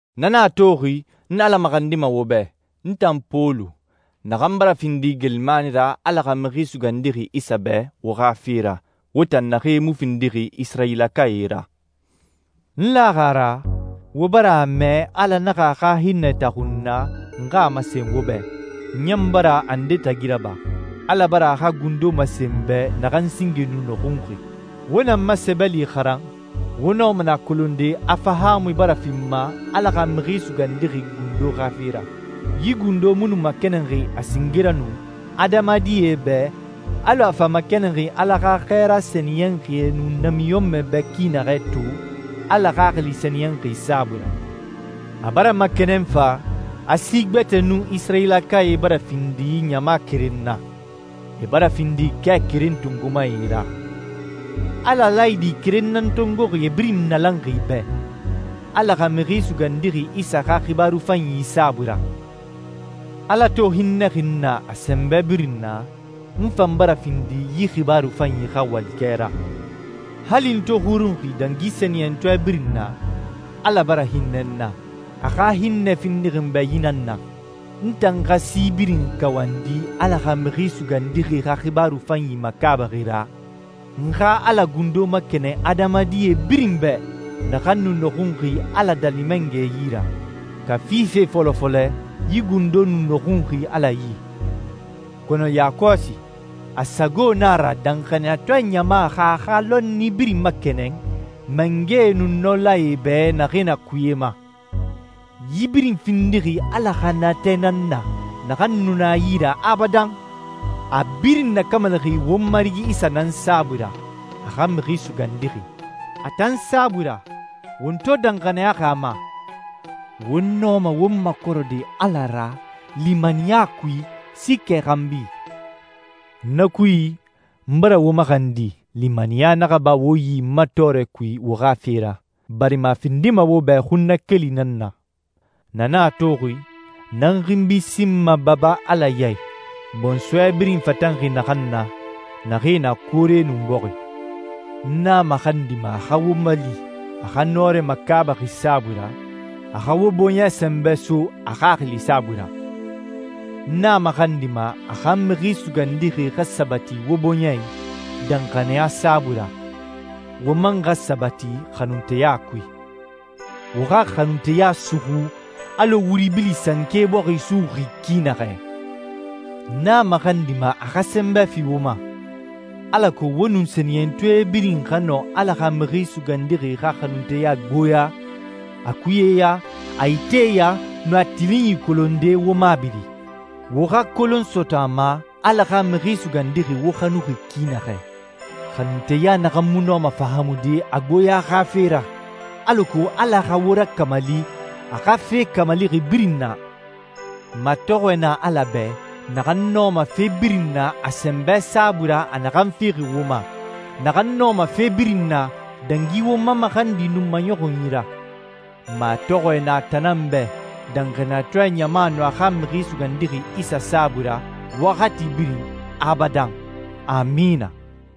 Na nan a toxi, n Ala maxandima wo bɛ, n tan Pɔlu, naxan bara findi geelimani ra Ala xa Mixi Sugandixi Isa bɛ wo xa fe ra, wo tan naxee mu findixi Isirayilakae ra. N laxi a ra, wo bara a mɛ Ala naxa a xa hinnɛ taxu n na n xa a masen wo bɛ. N ɲan bara a nde tagi raba, Ala bara a xa gundo masen n bɛ naxan singe nu nɔxunxi. Wo na n ma sɛbɛli xaran, wo nɔma nɛ a kolonde a fahaamui bara fi n ma Ala xa Mixi Sugandixi gundo xa fe ra. Yi gundo mu nu makɛnɛnxi a singe ra nu adamadie bɛ alɔ a fa makɛnɛnxi Ala xa xɛɛra sɛniyɛnxie nun namiɲɔnmɛe bɛ ki naxɛ to Ala Xaxili Sɛniyɛnxi saabui ra. A bara makɛnɛn fa, a si gbɛtɛe nun Isirayilakae bara findi ɲama keren na. E bara findi kɛ keren tongomae ra. Ala laayidi keren nan tongoxi e birin nalanxi bɛ, Ala xa Mixi Sugandixi Isa xa xibaaru fanyi saabui ra. Ala to hinnɛxi n na a sɛnbɛ birin na, n fan bara findi yi xibaaru fanyi xa walikɛ ra. Hali n to xurunxi dangi sɛniyɛntɔɛ birin na, Ala bara hinnɛ n na. A xa hinnɛ findixi n bɛ yi nan na: N tan xa si birin kawandi Ala xa Mixi Sugandixi xa xibaaru fanyi makaabaxi ra, n xa Ala gundo makɛnɛn adamadie birin bɛ, naxan nu nɔxunxi Ala Daali Mangɛ yi ra. Kafi fe fɔlɔ fɔlɛ yi gundo nu nɔxunxi Ala yi, kɔnɔ yakɔsi, a sago na a ra danxaniyatɔɛ ɲama xa a xa lɔnni birin makɛnɛn mangɛe nun nɔlae bɛ naxee na kuye ma. Yi birin findixi Ala xa natɛ nan na naxan nu na a yi ra abadan. A a birin nakamalixi won Marigi Isa nan saabui ra, a xa Mixi Sugandixi. A tan saabui ra, won to danxaniyaxi a ma, won nɔma won makɔrɛde Ala ra limaniya kui, siikɛ xanbi. Na kui, n bara wo maxandi limaniya naxa ba wo yi n ma tɔɔrɛ kui wo xa fe ra, barima a findima wo bɛ xunnakeli nan na. Na nan a toxi, n nan n xinbi sinma Baba Ala ya i, bɔnsɔɛ birin fatanxi naxan na, naxee na koore nun bɔxi. N a maxandima a xa wo mali a xa nɔrɛ makaabaxi saabui ra, a xa wo bɔɲɛ sɛnbɛ so a Xaxili saabui ra. N a maxandima a xa Mixi Sugandixi xa sabati wo bɔɲɛ i danxaniya saabui ra, wo man xa sabati xanunteya kui. Wo xa xanunteya suxu alɔ wuri bili sanke bɔxi suxuxi ki naxɛ. N a maxandima a xa sɛnbɛ fi wo ma, alako wo nun sɛniyɛntɔɛ birin xa nɔ Ala xa Mixi Sugandixi xa xanunteya gboya, a kuyɛya, a iteya, nun a tilinyi kolonde wo mabiri. Wo xa kolon sɔtɔ a ma Ala xa Mixi Sugandixi wo xanuxi ki naxɛ, xanunteya naxan mu nɔma fahaamude a gboya xa fe ra, alako Ala xa wo rakamali a xa fe kamalixi birin na. Matɔxɔɛ na Ala bɛ naxan nɔma fe birin na a sɛnbɛ saabui ra a naxan fixi wo ma, naxan nɔma fe birin na, dangi won ma maxandi nun maɲɔxunyi ra Matɔxɔɛ na a tan nan bɛ danxaniyatɔɛ ɲama nun a xa Mixi Sugandixi Isa saabui ra waxati birin, abadan. Amina.